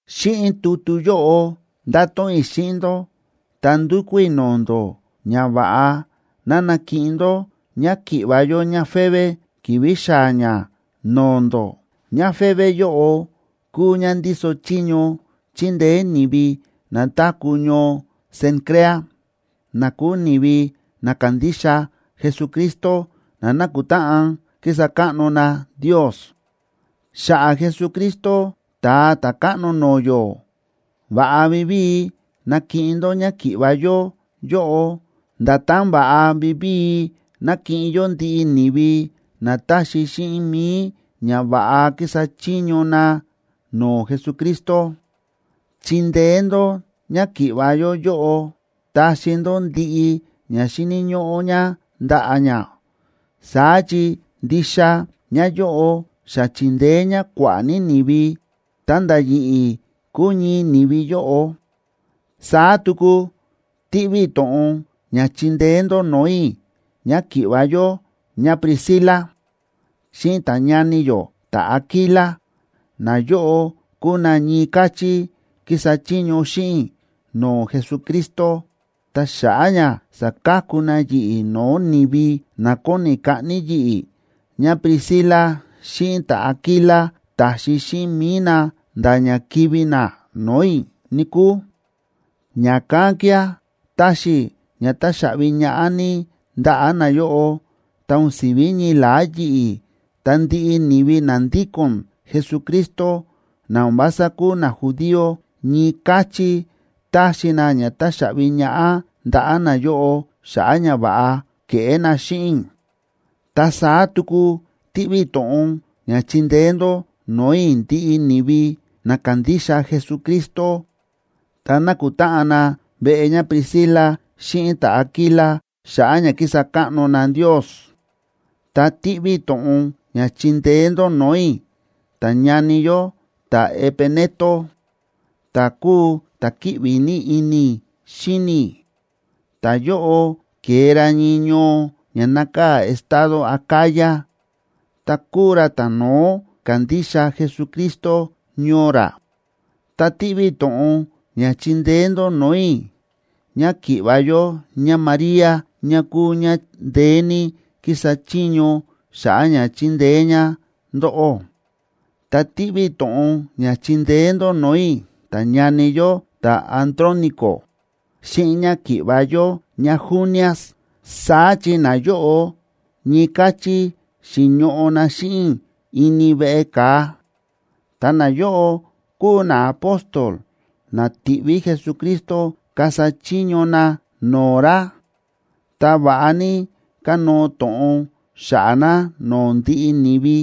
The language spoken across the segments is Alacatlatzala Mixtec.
Xíꞌin tutu yóꞌo ndáto̱ꞌon i̱ xíꞌin ndó ta ndúkú i̱ no̱o̱ ndó ñava̱ꞌa ná nakiꞌin ndó ñáki̱ꞌva̱ yó ñáFebe ki̱vi̱ xaa̱ ñá no̱o̱ ndó. ÑáFebe yóꞌo kúu ñá ndíso chiño chindeé ni̱vi na táku̱ ñoo Cencrea, na kúu ni̱vi na kándixa Jesucristo na nákutáꞌan kísa káꞌno na Ndios. Xa̱ꞌa̱ Jesucristo, Ta̱a Ta̱káꞌno no̱o̱ yó, va̱ꞌa vivíi nakiꞌin ndó ñáki̱ꞌva̱ yó yóꞌo, nda̱tán va̱ꞌa vivíi nákiꞌin yó ndiꞌi ni̱vi na táxi xíꞌin mi̱i ña va̱ꞌa kísa chiño na no̱o̱ Jesucristo. Chindeé ndó ñáki̱ꞌva̱ yó yóꞌo, taxi ndó ndiꞌi ña xíni̱ ñóꞌó ñá ndaꞌa̱ ñá, saá chi ndixa ñáyóꞌo xa chi̱ndeé ñá kua̱ꞌa̱ ní ni̱vi, ta̱nda̱ yi̱ꞌi̱ kúu ñii ni̱vi yóꞌo. Saá tuku tíꞌví i̱ to̱ꞌon ña chindeé ndó no̱o̱ i̱ ñáki̱ꞌva̱ yó ñáPriscila xíꞌin ta̱ñani yó ta̱Aquila. Nayóꞌo kúu na ñii káchí kísa chiño xíꞌin i̱ no̱o̱ Jesucristo. Ta xa̱ꞌa̱ ña saka̱ku na yi̱ꞌi̱ no̱o̱ ni̱vi na kóni kaꞌni yi̱ꞌi̱, ñáPriscila xíꞌin ta̱Aquila ta̱xi xíꞌin mi̱i na nda̱ ña kivi̱ na no̱o̱ i̱, níkúu. Ña̱kán kía̱ táxi i̱ ña táxaꞌvi ñaꞌá ní ndaꞌa̱ nayóꞌo. Ta o̱n si̱ví ñii la̱á yi̱ꞌi̱, ta ndiꞌi ni̱vi na ndíko̱n Jesucristo, na o̱n vása kúu najudío ñii káchí táxi na ña táxaꞌvi ñaꞌá ndaꞌa̱ nayóꞌo xa̱ꞌa̱ ñava̱ꞌa ke̱ꞌé na xíꞌin i̱. Ta saá tuku tíꞌví i̱ to̱ꞌon ña chindeé ndó no̱o̱ i̱ ndiꞌi ni̱vi na kándixa Jesucristo ta nákutáꞌan na veꞌe ñáPriscila xíꞌin ta̱Aquila xa̱ꞌa̱ ña kísa káꞌno na Ndios. Ta tíꞌví i̱ to̱ꞌon ña chindeé ndó no̱o̱ i̱ ta̱ñani yó ta̱Epeneto, ta̱ kúu ta̱ kíꞌvi ní ini i̱ xíni i̱. Ta̱yóꞌo ke̱e ra ñii ñoo ña nákaa̱ estado Acaya, ta kúu ra ta̱no̱ó ka̱ndixa Jesucristo ñoo ra. Ta tíꞌví i̱ to̱ꞌon ña chindeé ndó no̱o̱ i̱ ñáki̱ꞌva̱ yó ñáMaría, ñá kúu ñá ndeé ní kísa chiño xa̱ꞌa̱ ña chindeé ñá ndóꞌó. Ta tíꞌví i̱ to̱ꞌon ña chindeé ndó no̱o̱ i̱ ta̱ñani yó ta̱Andrónico xíꞌin ñáki̱ꞌva̱ yó ñáJunias.a Saá chi nayóꞌo ñii káchí xi̱ñoꞌo na xíꞌin i̱ ini veꞌe ka̱a, ta nayóꞌo kúu naapóstol na ti̱ꞌví Jesucristo kasa chiño na no̱o̱ ra, ta va̱ꞌa ní kánóo to̱ꞌon xa̱ꞌa̱ na no̱o̱ ndiꞌi ni̱vi.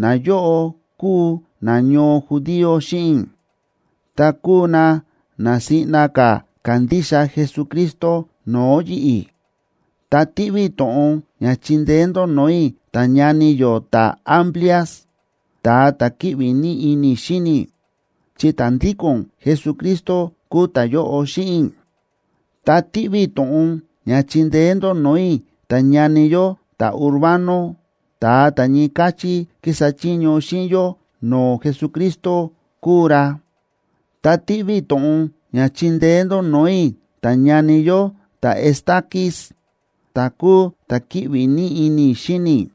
Nayóꞌo kúu nañoo judío xíꞌin i̱, ta kúu na na siꞌna ka̱ ka̱ndixa Jesucristo no̱o̱ yi̱ꞌi̱. Ta tíꞌví i̱ to̱ꞌon ña chindeé ndó no̱o̱ i̱ ta̱ñani yó ta̱Amplias, ta̱a ta̱ kíꞌvi ní ini i̱ xíni i̱, chi ta̱ ndíko̱n Jesucristo kúu ta̱yóꞌo xíꞌin i̱. Ta tíꞌví i̱ to̱ꞌon ña chindeé ndó no̱o̱ i̱ ta̱ñani yó ta̱Urbano, ta̱a ta̱ ñii káchí kísa chiño xíꞌin yó no̱o̱ Jesucristo kúu ra. Ta tíꞌví i̱ to̱ꞌon ña chindeé ndó no̱o̱ i̱ ta̱ñani yó ta̱Estaquis, ta̱ kúu ta̱ kíꞌvi ní ini i̱ xíni i̱.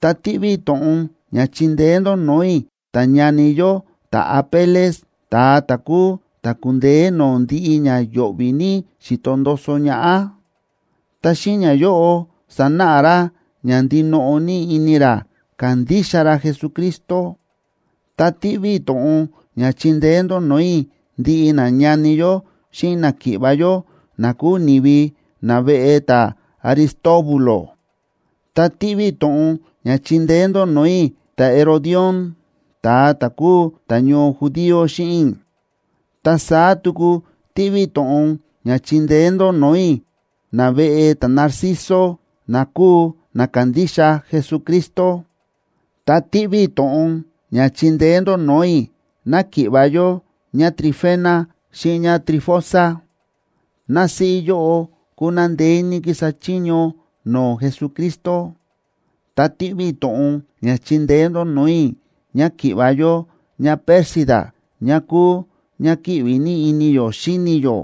Ta tíꞌví i̱ to̱ꞌon ña chindeé ndó no̱o̱ i̱ ta̱ñani yó ta̱Apeles, ta̱a ta̱ kúu ta̱ ku̱ndeé no̱o̱ ndiꞌi ña yo̱ꞌvi̱ ní xi̱to ndoso ñaꞌá, ta xíꞌin ñayóꞌo sánáꞌa ra ña ndinoꞌo ní ini ra kándixa ra Jesucristo. Ta tíꞌví i̱ to̱ꞌon ña chindeé ndó no̱o̱ i̱ ndiꞌi nañani yó xíꞌin náki̱ꞌva̱ yó na kúu ni̱vi naveꞌe ta̱Aristóbulo. Ta tíꞌví i̱ to̱ꞌon ña chindeé ndó no̱o̱ i̱ ta̱Herodión, ta̱a ta̱ kúu ta̱ñoo judío xíꞌin i̱. Ta saá tuku tíꞌví i̱ to̱ꞌon ña chindeé ndó no̱o̱ i̱ naveꞌe ta̱Narciso na kúu na kándixa Jesucristo. Ta tíꞌví i̱ to̱ꞌon ña chindeé ndó no̱o̱ i̱ náki̱ꞌva̱ yó ñáTrifena xíꞌin ñáTrifosa. Násíꞌí yóꞌo kúu ná ndeé ní kísa chiño no̱o̱ Jesucristo. Ta tíꞌví i̱ to̱ꞌon ña chindeé ndó no̱o̱ i̱ ñáki̱ꞌva̱ yó ñáPérsida ñá kúu ñá kíꞌvi ní ini yó xíni yó.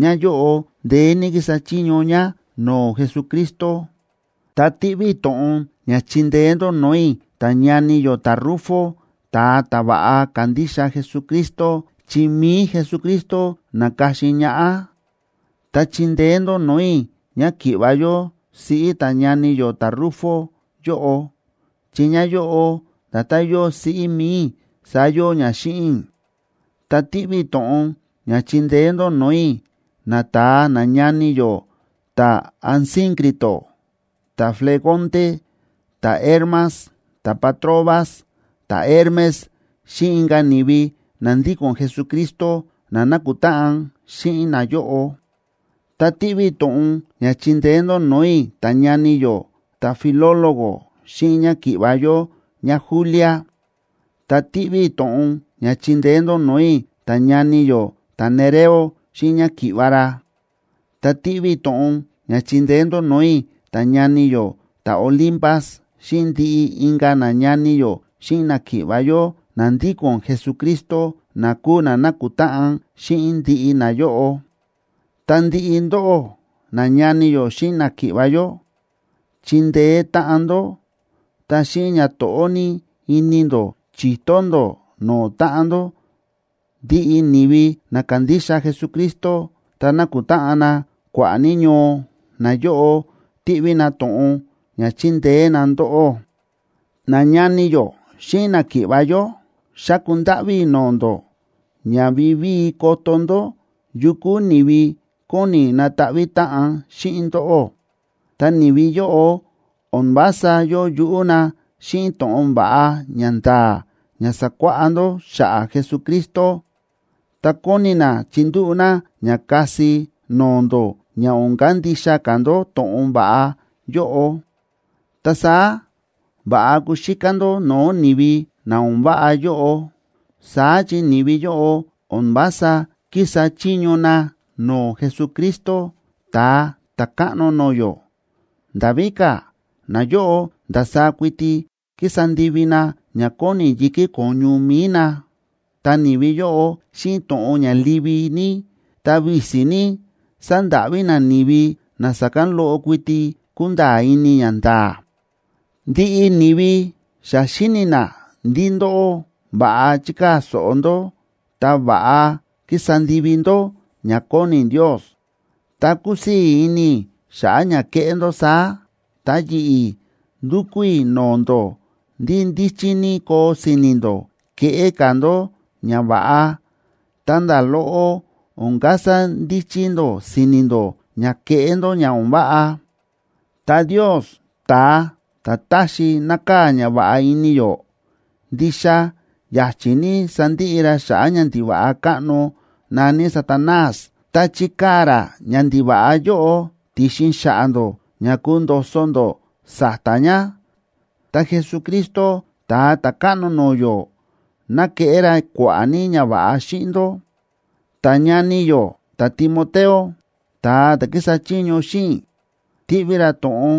Ñáyóꞌo ndeé ní kísa chiño ñá no̱o̱ Jesucristo. Ta tíꞌví i̱ to̱ꞌon ña chindeé ndó no̱o̱ i̱ ta̱ñani yó ta̱Rufo, ta̱a ta̱ va̱ꞌa kándixa Jesucristo, chi mi̱i Jesucristo na̱ka̱xin ñaꞌá. Ta chindeé ndó no̱o̱ i̱ ñáki̱ꞌva̱ yó siꞌí ta̱ñani yó ta̱Rufo yóꞌo, chi ñáyóꞌo nda̱tán yóo siꞌí mi̱i i̱ saá yóo ñá xíꞌin i̱. Ta tíꞌví i̱ to̱ꞌon ña chindeé ndó no̱o̱ i̱ nata̱a nañani yó ta̱Asíncrito, ta̱Flegonte, ta̱Hermas, ta̱Patrobas, ta̱Hermes xíꞌin inka̱ ni̱vi na ndíko̱n Jesucristo na nákutáꞌan xíꞌin nayóꞌo. Ta tíꞌví i̱ to̱ꞌon ña chindeé ndó no̱o̱ i̱ ta̱ñani yó ta̱Filólogo xíꞌin ñáki̱ꞌva̱ yó ñáJulia, ta tíꞌví i̱ to̱ꞌon ña chindeé ndó no̱o̱ i̱ ta̱ñani yó ta̱Nereo xíꞌin ñáki̱ꞌva̱ ra. Ta tíꞌví i̱ to̱ꞌon ña chindeé ndó no̱o̱ i̱ ta̱ñani yó ta̱Olimpas xíꞌin ndiꞌi inka̱ nañani yó xíꞌin náki̱ꞌva̱ yó na ndíko̱n Jesucristo na kúu na nákutáꞌan xíꞌin ndiꞌi nayóꞌo. Ta ndiꞌi ndóꞌó, nañani yó xíꞌin náki̱ꞌva̱ yó, chindeé táꞌan ndó ta xíꞌin ñato̱ꞌó ní ini ndó chi̱to ndó no̱o̱ táꞌan ndó. Ndiꞌi ni̱vi na kándixa Jesucristo ta nákutáꞌan na kua̱ꞌa̱ ní ñoo, nayóꞌo tíꞌví na to̱ꞌon ña chindeé na ndóꞌó. Nañani yó xíꞌin náki̱ꞌva̱ yó, xáku ndáꞌví i̱ no̱o̱ ndó ña vivíi koto ndó yu kúu ni̱vi kóni nataꞌví táꞌan xíꞌin ndóꞌó. Ta ni̱vi yóꞌo o̱n vása yóo yuꞌú na xíꞌin to̱ꞌon va̱ꞌa ña nda̱a̱ ña sa̱kuáꞌá ndó xa̱ꞌa̱ Jesucristo, ta kóni na chindúꞌu̱ na ña kasi no̱o̱ ndó ña o̱n kandixa ka̱ ndó to̱ꞌon va̱ꞌa yóꞌo. Ta saá va̱ꞌa kuxíká ndó no̱o̱ ni̱vi na o̱n váꞌa yóꞌo. Saá chi ni̱vi yóꞌo o̱n vása kísa chiño na no̱o̱ Jesucristo, Ta̱a Ta̱káꞌno no̱o̱ yó. Nda̱ víka̱, nayóꞌo ndasaá kuiti kísa ndivi na ña kóni yi̱kí ko̱ñu mi̱i na. Ta ni̱vi yóꞌo, xíꞌin to̱ꞌon ña livi ní ta visi ní, sándáꞌví na ni̱vi na sa̱kán loꞌo kuiti kúnda̱a̱ ini ñanda̱a̱. Ndiꞌi ni̱vi xa xíni̱ na ndí ndóꞌó va̱ꞌa chíkaa̱ so̱ꞌo ndó ta va̱ꞌa kísa ndivi ndó ña kóni Ndios. Ta kúsii̱ ini i̱ xa̱ꞌa̱ ña kéꞌé ndó saá. Ta yi̱ꞌi̱ ndúkú i̱ no̱o̱ ndó ndí ndíchí ní koo si̱ni̱ ndó keꞌé ka̱ ndó ñava̱ꞌa, ta nda̱ loꞌo o̱n kasa ndíchí ndó si̱ni̱ ndó ña keꞌé ndó ña o̱n váꞌa. Ta Ndios, ta̱a ta̱ táxi nákaa̱ ñava̱ꞌa ini yó, ndixa ya̱chi̱ ní sandiꞌi ra xa̱ꞌa̱ ñandiva̱ꞌa káꞌno na̱ní Satanás, ta chikaa̱ ra ñandiva̱ꞌa yóꞌo ti̱xin xa̱ꞌa̱ ndó ña kundo̱so̱ ndó sa̱ta̱ ña. Ta Jesucristo, Ta̱a Ta̱káꞌno no̱o̱ yó, ná keꞌé ra kua̱ꞌa̱ ní ñava̱ꞌa xíꞌin ndó. Ta ñani yó ta̱Timoteo, ta̱a ta̱ kísa chiño xíꞌin i̱, tíꞌví ra to̱ꞌon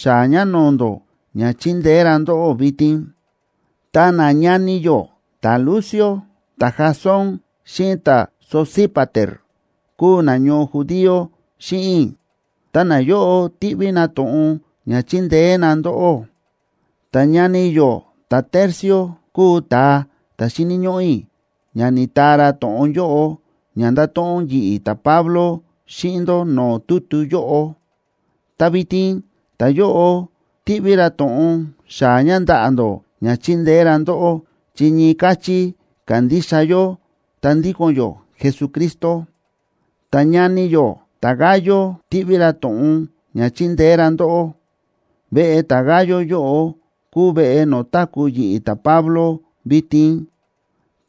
xaa̱ ña no̱o̱ ndó ña chindeé ra ndóꞌó vitin. Ta nañani yó ta̱Lucio, ta̱Jasón xíꞌin ta̱Sosípater kúu nañoo judío xíꞌin i̱, ta nayóꞌo tíꞌví na to̱ꞌon ña chindeé na ndóꞌó. Ta ñani yó ta̱Tercio kúu ta̱a ta̱ xíni̱ ñóꞌó i̱ ña ni̱taa ra to̱ꞌon yóꞌo ña nda̱to̱ꞌon yi̱ꞌi̱, ta̱Pablo, xíꞌin ndó no̱o̱ tutu yóꞌo, ta vitin ta̱yóꞌo tíꞌví ra to̱ꞌon xaa̱ ña ndaꞌa̱ ndó ña chindeé ra ndóꞌó, chi ñii káchí kándixa yó ta ndíko̱n yó Jesucristo. Ta ñani yó ta̱Gayo tíꞌví ra to̱ꞌon ña chindeé ra ndóꞌó. Veꞌe ta̱Gayo yóꞌo kúu veꞌe no̱o̱ táku̱ yi̱ꞌi̱ ta̱Pablo vitin,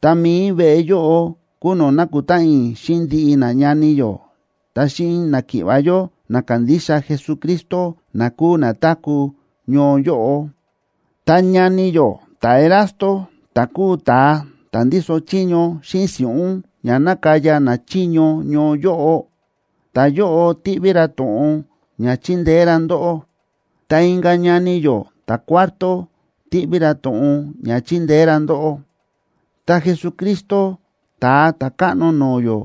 ta mi̱i veꞌe yóꞌo kúu no̱o̱ nákutáꞌan i̱ xíꞌin ndiꞌi nañani yó ta xíꞌin náki̱ꞌva̱ yó na kándixa Jesucristo na kúu na táku̱ ñoo yóꞌo. Ta ñani yó ta̱Erasto, ta̱ kúu ta̱a ta̱ ndíso chiño xíꞌin si̱ꞌún ña nákaya nachiño ñoo yóꞌo, ta̱yóꞌo tíꞌví ra to̱ꞌon ña chindeé ra ndóꞌó. Ta inka̱ ñani yó ta̱Cuarto tíꞌví ra to̱ꞌon ña chindeé ra ndóꞌó. Ta Jesucristo, Ta̱a Ta̱káꞌno no̱o̱ yó,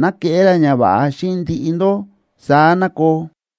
ná keꞌé ra ñava̱ꞌa xíꞌin ndiꞌi ndó. Saá ná koo.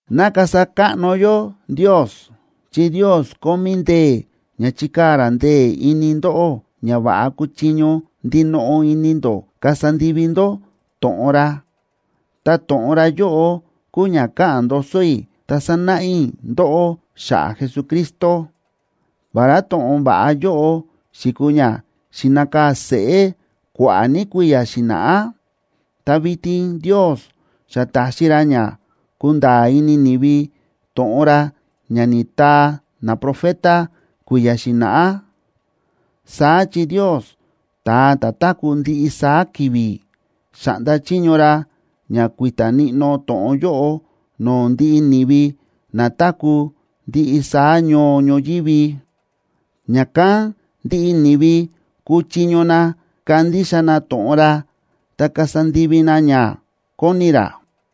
¡Ná kasa káꞌno yó Ndios! Chi Ndios kómí ndee̱ ña chikaa̱ ra ndee̱ ini ndóꞌó ña va̱ꞌa kuchiño ndinoꞌo ini ndó kasa ndivi ndó to̱ꞌon ra. Ta to̱ꞌon ra yóꞌo kúu ña káꞌa̱n ndoso i̱ ta sánáꞌa i̱ ndóꞌó xa̱ꞌa̱ Jesucristo. Vará to̱ꞌon va̱ꞌa yóꞌo xi̱kuu ña xi̱nakaa̱ seꞌé kua̱ꞌa̱ ní kui̱ya̱ xi̱na̱ꞌá, ta vitin Ndios xa ta̱xi ra ña kúnda̱a̱ ini ni̱vi to̱ꞌon ra ña ni̱taa naprofeta kui̱ya̱ xi̱na̱ꞌá. Saá chi Ndios, ta̱a ta̱ táku̱ ndiꞌi saá ki̱vi̱, xa̱ꞌnda chiño ra ña kui̱ta̱ níꞌnó to̱ꞌon yóꞌo no̱o̱ ndiꞌi ni̱vi na táku̱ ndiꞌi saá ñoo ñoyívi, ña̱kán ndiꞌi ni̱vi kuchiño na kandixa na to̱ꞌon ra ta kasa ndivi na ña kóni ra.